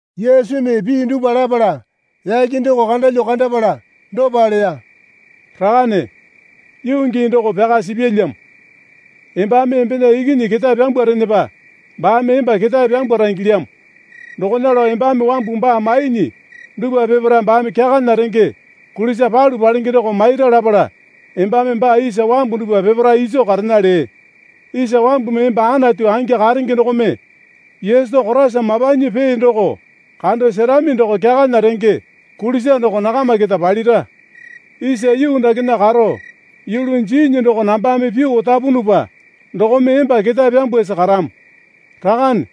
Yesumi pii dupwa lapala yake doko kandalyuo kandapala dopa leya. Rakane, yuu gii doko pyaka sipyalyamo. Embame embena Ikinyi ketae pyambwarenepa baame emba ketae pyambwara ingilyamo. Dokona lao embame wambu baa maiinyi dupwa peparae baame kyakana renge kulisa palu palenge doko maira lapala embame baa isa wambu dupwa peparae iso karena lee. Isa wambumi emba Anatu angi karenge dokome Yesu Koraisa mapanyi pee doko kando serami doko kyakana renge kulisa doko nakama keta palira. Isa yuu dakena karo yulu jiinyi doko nambame pyuo otapunupa dokome emba ketae pyambwasi karamo. Rakane,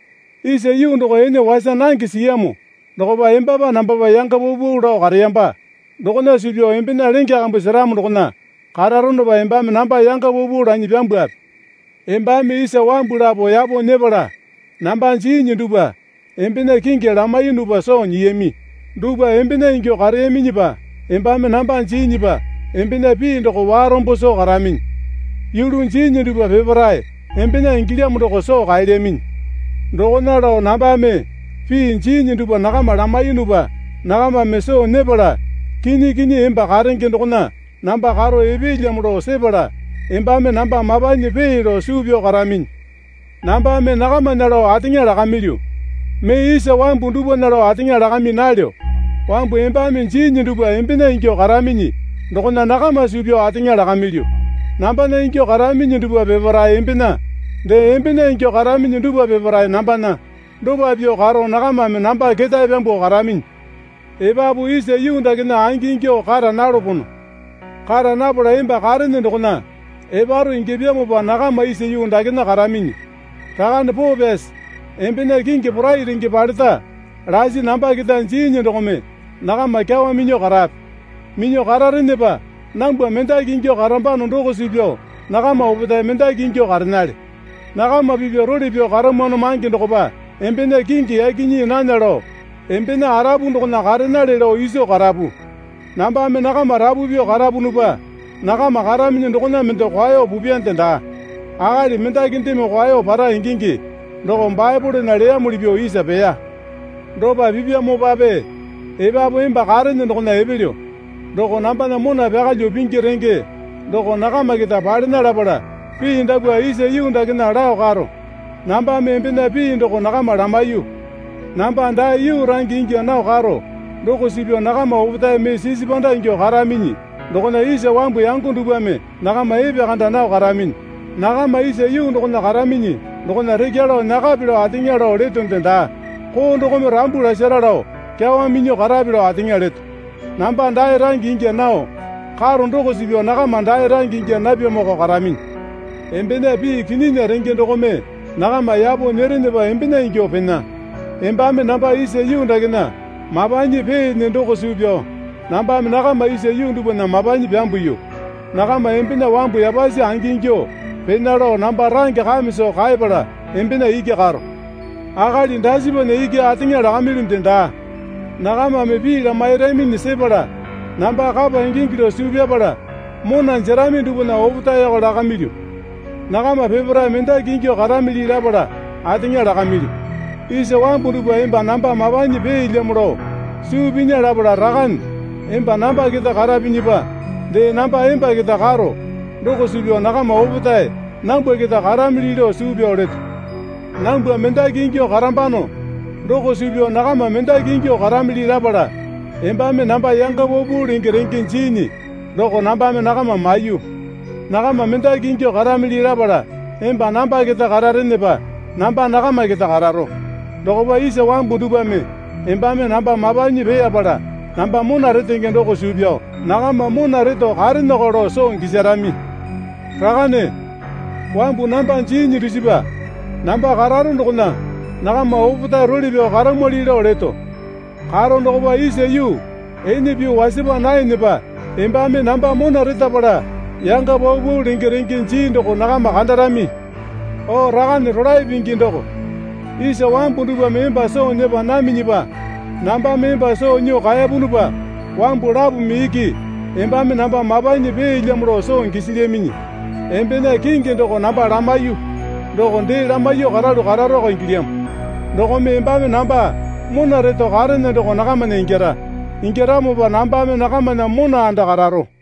isa yuu doko ene wasa nange siyamo dokopa embapa nambapa yanga paupau lao kareyamba dokona suu pyao embena lenge kambu seramo dokona kararonopa embame namba yanga paupau lanyi pyambwape. Embame isa wambu lapo yapo nyepala namba jiinyi dupwa embena kingi lamaiyunupa soo nyiyami. Dupwa embena ingyuo kareyaminyipa embame namba jiinyipa embena pii doko warombo soo karaminyi. Yulu jiinyi dupwa peparae embena ingilyamo doko soo kaelyaminyi. Dokona lao nambame pii jiinyi dupwa nakama lamaiyunupa nakamame soo nyepala kinyi kinyi emba karenge dokona namba karo epeelyamo lao sepala embame namba mapanyi pee lao suu pyao karaminyi. Nambame nakamana lao ateŋa lakamilyu. Mee isa wambu dupwana lao ateŋa lakami nalyo. Wambu embame jiinyi dupwa embena ingyuo karaminyi dokona nakama suu pyao ateŋa lakamilyu. Nambana ingyuo karaminyi dupwa peparae embena. Dee embena ingyuo karaminyi dupwa peparae nambana. Dopa pyuo karo nakamame namba ketae pyambuo karaminyi. Epapu isa yuu dakena angi ingyuo kara nalopono. Kara napala emba karene dokona eparo ingyapyamopa nakama isa yuu dakena karaminyi. Rakane poo pyasi embena kingi porai renge paleta lasi namba keta jiinyi dokome nakama kyawa minyuo karape. Minyuo kararenepa nambwa mendaki ingyuo karambano doko suu pyao nakama opetae mendaki ingyuo karenale. Nakama pipya role pyao karamwano mange dokopa embena kingi yaki nyii nana lao embena arapu dokona karenale lao iso karapu. Nambame nakama rapu pyuo karapunupa nakama karaminyi dokona mende kwao pupyande daa. Akali mendakindeme kwao para ingingi doko Baepolena leyamuli pyuo isa peya. Dopa pipyamopape epapu emba karene dokona epelyo. Doko nambana mona pyakalyuo pingi renge doko nakama keta palena lapala pii dapwa isa yuu dakena lao karo. Nambame embena pii doko nakama lamaiyu. Namba dae yuu range ingya nao karo doko suu pyao nakama opetae mee sisi panda ingyuo karaminyi dokona isa wambu yango dupwame nakama epekanda nao karaminyi. Nakama isa yuu dokona karaminyi dokona rekya lao nyakape lao ateŋa lao letonde daa. Koo dokome rambu lasara lao kyawa minyuo karape lao ateŋa leto. Namba dae range ingya nao karo doko suu pyao nakama dae range ingya napyamoko karaminyi. Embena pii kinyinya renge dokome nakama yapo nyerenepa embena ingyuo pena. Embame namba isa yuu dakena mapanyi peene doko suu pyao nambame nakama isa yuu dupwana mapanyi pyambuyu. Nakama embena wambu yapasi angingyuo pena lao namba range kame soo kaepala embena iki karo. Akali dasipana iki ateŋa lakamilyunde daa. Nakamame pii lamairaminyi sepala namba kapa ingingi lao suu pyapala mona jerami dupwana opetaeko lakamilyu. Nakama peparae mendaki ingyuo karamili lapala ateŋa lakamilyu. Isa wambu dupwa emba namba mapanyi peelyamo lao suu pinya lapala Rakane emba namba keta karapinyipa dee namba emba keta karo doko suu pyao nakama opetae nambwa keta karamili lao suu pyao leto. Nambwa mendaki ingyuo karambano doko suu pyao nakama mendaki ingyuo karamili lapala embame namba yanga paupau lenge renge jiinyi doko nambame nakama maiyu. Nakama mendaki ingyuo karamili lapala emba namba keta kararenepa namba nakama keta kararo. Dokopa isa wambu dupwame embame namba mapanyi peeyapala namba mona retenge doko suu pyao nakama mona reto kareneko lao soo gisarami. Rakane, wambu namba jiinyi dusipa namba kararo dokona nakama opetae role pyao karamwali lao leto. Karo dokopa isa yuu ene pyuo wasapa naenepa embame namba mona retapala yanga paupau lenge renge jii doko nakama kandarami. O Rakane rolae pingi doko, isa wambu dupwame emba soo nyepa naminyipa nambame emba soo nyuo kaepunupa wambu lapome iki embame namba mapanyi peelyamo lao soo gisilyaminyi. Embena kingi doko namba lamaiyuo doko dee lamaiyuo karalu kararoko ingilyamo. Dokome embame namba mona reto karene doko nakamana ingyara. Ingyaramopa nambame nakamana mona anda kararo.